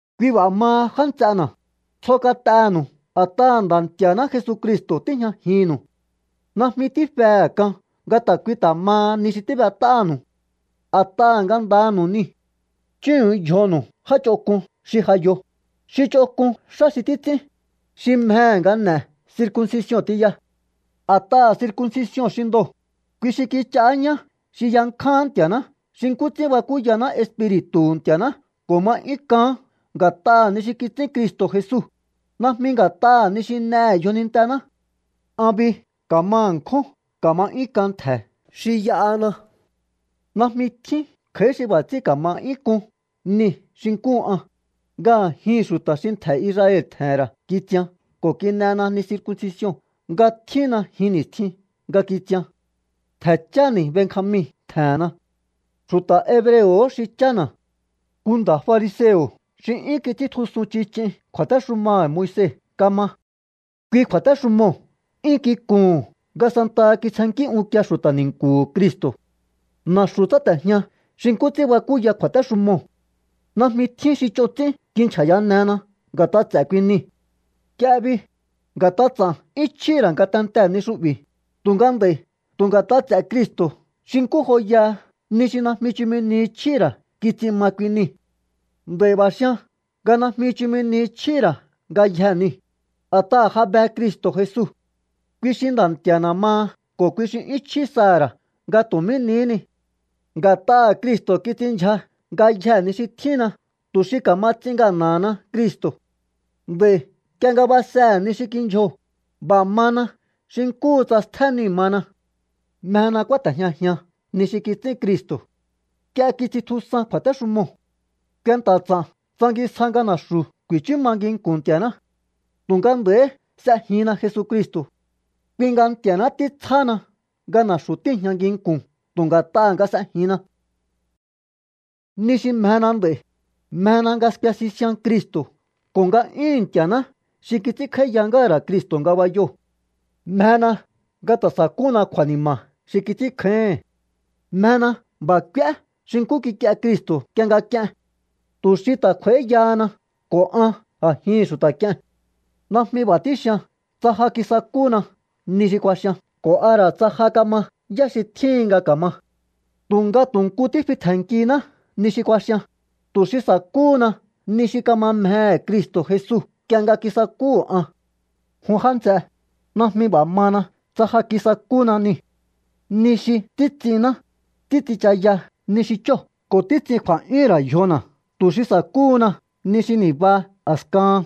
Kui b'a̱ maha, já nts'ena̱, tsjo kat'enu̱u a̱t'aha̱ Nda̱ Nti̱a̱ná Jesucristo̱ tíjñajinnu̱u. Najmi tífehe̱ k'an nga ta̱ kui ta̱ maha ni xi tíb'et'ánu̱u, a̱t'aha̱ ngandanu̱u niu̱. Chúhu̱un yjonu̱u já ch'onk'un xi ja yo, xi ch'onk'un xá xi títs'ín, xi mjehe̱ nga n'e̱ circuncision tiya. A̱t'aha̱ circuncision xi ndoo̱, kui xi kich'aá ñá xi yankjáán Nti̱a̱ná xi nkú ts'ín bakúyaná Espiri̱tu̱hu̱ Nti̱a̱ná ko̱ ma 'yún k'aán nga̱t'aha̱ ni xi kits'ín Cristo̱ Jesu, najmi nga̱t'aha̱ ni xi n'ehe̱ yjonintená. An bi ka̱ma ṉkjún ka̱ma 'yún k'an ntje̱ xi y'ahana. Najmi tjín kj'a̱í xi b'a̱ ts'ín ka̱ma 'yún k'un nii̱ xi nkúhu an, nga a̱jihi̱n xu̱ta̱ xi ntje̱ Israel tje̱he̱n ra̱ kitsian ko̱ kin'ena ni circuncision nga tjínna jin ni̱stjin nga kitsian. Ntje̱ cháni̱ Benjamin tje̱henna. Xu̱ta̱ hebreo̱hó xi chána̱. Nku nda̱ fariseo̱ xi 'yún kits'íntjusun chich'in kju̱a̱téxumaha̱ Moise kama. Kui kju̱a̱téxumoo̱ 'yún kikuhu̱n nga santaha kitsjennkí unkie xu̱ta̱ ni̱nku̱hu̱ Cristo̱. Na̱xu̱ tsáte̱jña xi nkú ts'ín bakúya kju̱a̱téxumoo̱. Najmi tjín xi ch'on ts'ín kinchja̱yanena nga̱t'a ts'e̱ kui nii̱. Nk'ie bi, nga̱t'a ts'a̱n 'yún chjíhi̱ ra̱ ngatentee̱ ni xu'bi̱, tu̱nga nd'a̱i̱ tu̱ nga̱t'a ts'e̱ Cristo̱ xi nkú joyaha ni xi najmi chumi ni chjíhi̱ ra̱ kits'in ma kui niu̱. Nd'a̱i̱ b'a̱ xian nga najmi chumi ni chjíhí ra̱ ngayjee̱ niu̱, a̱t'aha̱ ja be Cristo̱ Jesu. Kui xi Nda̱ Nti̱a̱na̱ maha ko̱ kui xi 'yún chjí saha̱ ra̱ nga tu̱ mí nihí ni. Nga̱t'aha̱ Cristo̱ kits'inndyja ngayjee̱ ni xi tjínna tu̱ xi ka̱ma ts'in ngana̱hana Cristo̱. Nd'a̱i̱ nk'ie nga basehe̱ ni xi kindyjoo̱, b'a̱ mana xi nkúhu tsa stjé niu̱ mana. Mjena kúáte̱jñajian ni xi kits'ín Cristo̱. Nk'ie kits'intjusan kju̱a̱téxumoo̱. Kuenta̱ ts'a̱n tsangisja nga na̱xu̱ ku̱i̱chú ma nginku̱n Nti̱a̱ná. Tu̱nga nd'a̱i̱hí s'ejinna Jesucristo̱. Kui nga Nti̱a̱ná títsjáhana nga na̱xu̱ tíi̱jña nginku̱n tu̱ nga̱t'aha̱ nga s'ejinna. Ni xi mjena nd'a̱i̱, mjena nga skue sisian Cristo̱ ko̱ nga'yúhu̱n Nti̱a̱ná xi kits'ínkj'áíya ngáha̱ ra̱ Cristo̱ ngabayoo̱. Mjena nga ta̱ sa̱kúna kju̱a̱ni̱ma̱ xi kits'ínkjáíhi̱n. Mjena b'a̱ k'úé xi nkú kik'ie Cristo̱ nk'ie nga k'ien tu̱ xi ta̱ kj'u̱a̱íyahana ko̱ an a̱jihi̱n xu̱ta̱ k'ie̱n. Najmi b'a̱ tíxian tsa ja kisakúna ni xi kuaxian ko̱ a ra̱ tsa ja kama yá xi tjíhin nga ka̱ma. Tu̱nga tu̱ nku tífi tje̱nnkiná ni xi kuaxian, tu̱ xi sa̱kúhuna ni xi kama mjehe̱ Cristo̱ Jesu nk'ie nga kisakúhu̱ an. Jun já nts'e, najmi b'a̱ mana tsa ja kisakúna niu̱. Ni xi títs'inná, títs'inchaya ni xi chóo̱ ko̱ títs'in kju̱a̱'yúhún ra̱ yjona̱ tu̱ xi sa̱kúhuna ni xi ni̱ba a̱skahan.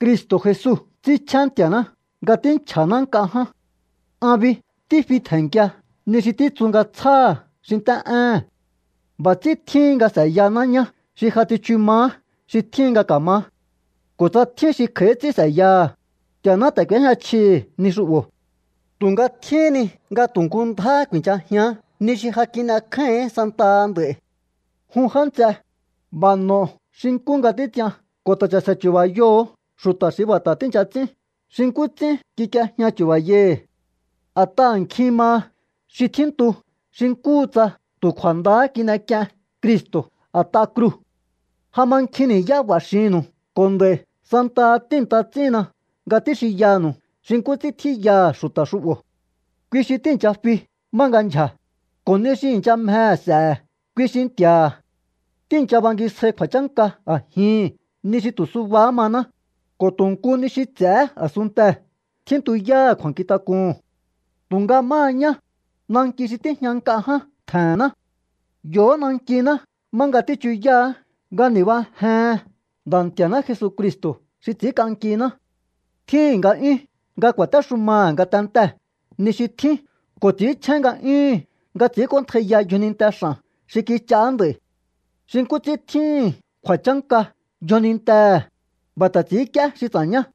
Cristo̱ Jesu ts'ínchjén Nti̱a̱ná nga tínchja̱ná nk'a ján. An bi tífi tje̱nnkia ni xi títsu nga tsjáha̱ xi nt'é éhe̱n. B'a̱ ts'ín tjíhin nga s'e̱yahaná ñá xi ja tsichu maá xi tjíhin nga ka̱maá. Ko̱ tsa tjín xi kj'a̱í ts'ín s'e̱yaha̱, Nti̱a̱ná ta̱ k'u̱éjña chjihi̱ ni xu'bo̱. Tu̱nga tjíhín ni nga tu̱ nku ndjáhá ku̱i̱nchajián ni xi ja kin'ekjáíhi̱ín santaha nd'a̱i̱. Jun já nts'e, b'a̱ n'o̱o xi nkú nga títs'ian ko̱ ta̱ cha̱se̱ chu̱ba̱yoho̱o xu̱ta̱ xi b'a̱ ta̱ tíi̱ncha ts'ín xi nkú ts'ín kik'iejña chu̱ba̱yai̱hi̱. A̱t'aha̱ nkjin maha xi tjíntu xi nkúhu tsa tu̱ kju̱a̱ndahá kin'ek'ien Cristo̱ a̱t'a kruu̱. Ja ma nkjin ni̱yá b'a̱ xinnu̱u ko̱ nd'a̱i̱ santaha tíi̱nta ts'íhinna nga tíxinyanu̱u xi nkú ts'ín tjíyaha̱ xu̱ta̱ xu'bo̱. Kui xi tíi̱ncha fi má nga ndyja̱, ko̱ ni xi i̱ncha mjehe̱ s'e̱he̱ kui xi nti̱a̱ha̱. Tíi̱ncha bangisjai kju̱a̱chánka a̱jihi̱n ni xi tu̱ subahá maná, ko̱ tu̱ nku ni xi ts'e̱hé a̱sunntee̱ tjíntuyáha̱ kju̱a̱nkjintak'uhu̱n. Tu̱nga máha ñá, nanki xi tíjña nk'a ján tje̱he̱nná. Yo̱hó nankiná má nga tíchuyáha̱á nga ni̱bajehen Nda̱ Nti̱a̱ná Jesucristo̱ xi ts'i̱ínk'ankiná. Tjíhi̱n nga'yún nga ku̱a̱téxumaha̱ ngatentee̱ ni xi tjín ko̱ ts'i̱ínchjén nga'yúhu̱n nga ts'i̱ínk'óntjaiya yjoninte x'a̱n xi kich'aá nd'a̱i̱. Xi nkú ts'ín tjíhi̱n kju̱a̱chánka yjonintehe̱, b'a̱ ta̱ ts'i̱ínk'íé xi ts'a̱ñá.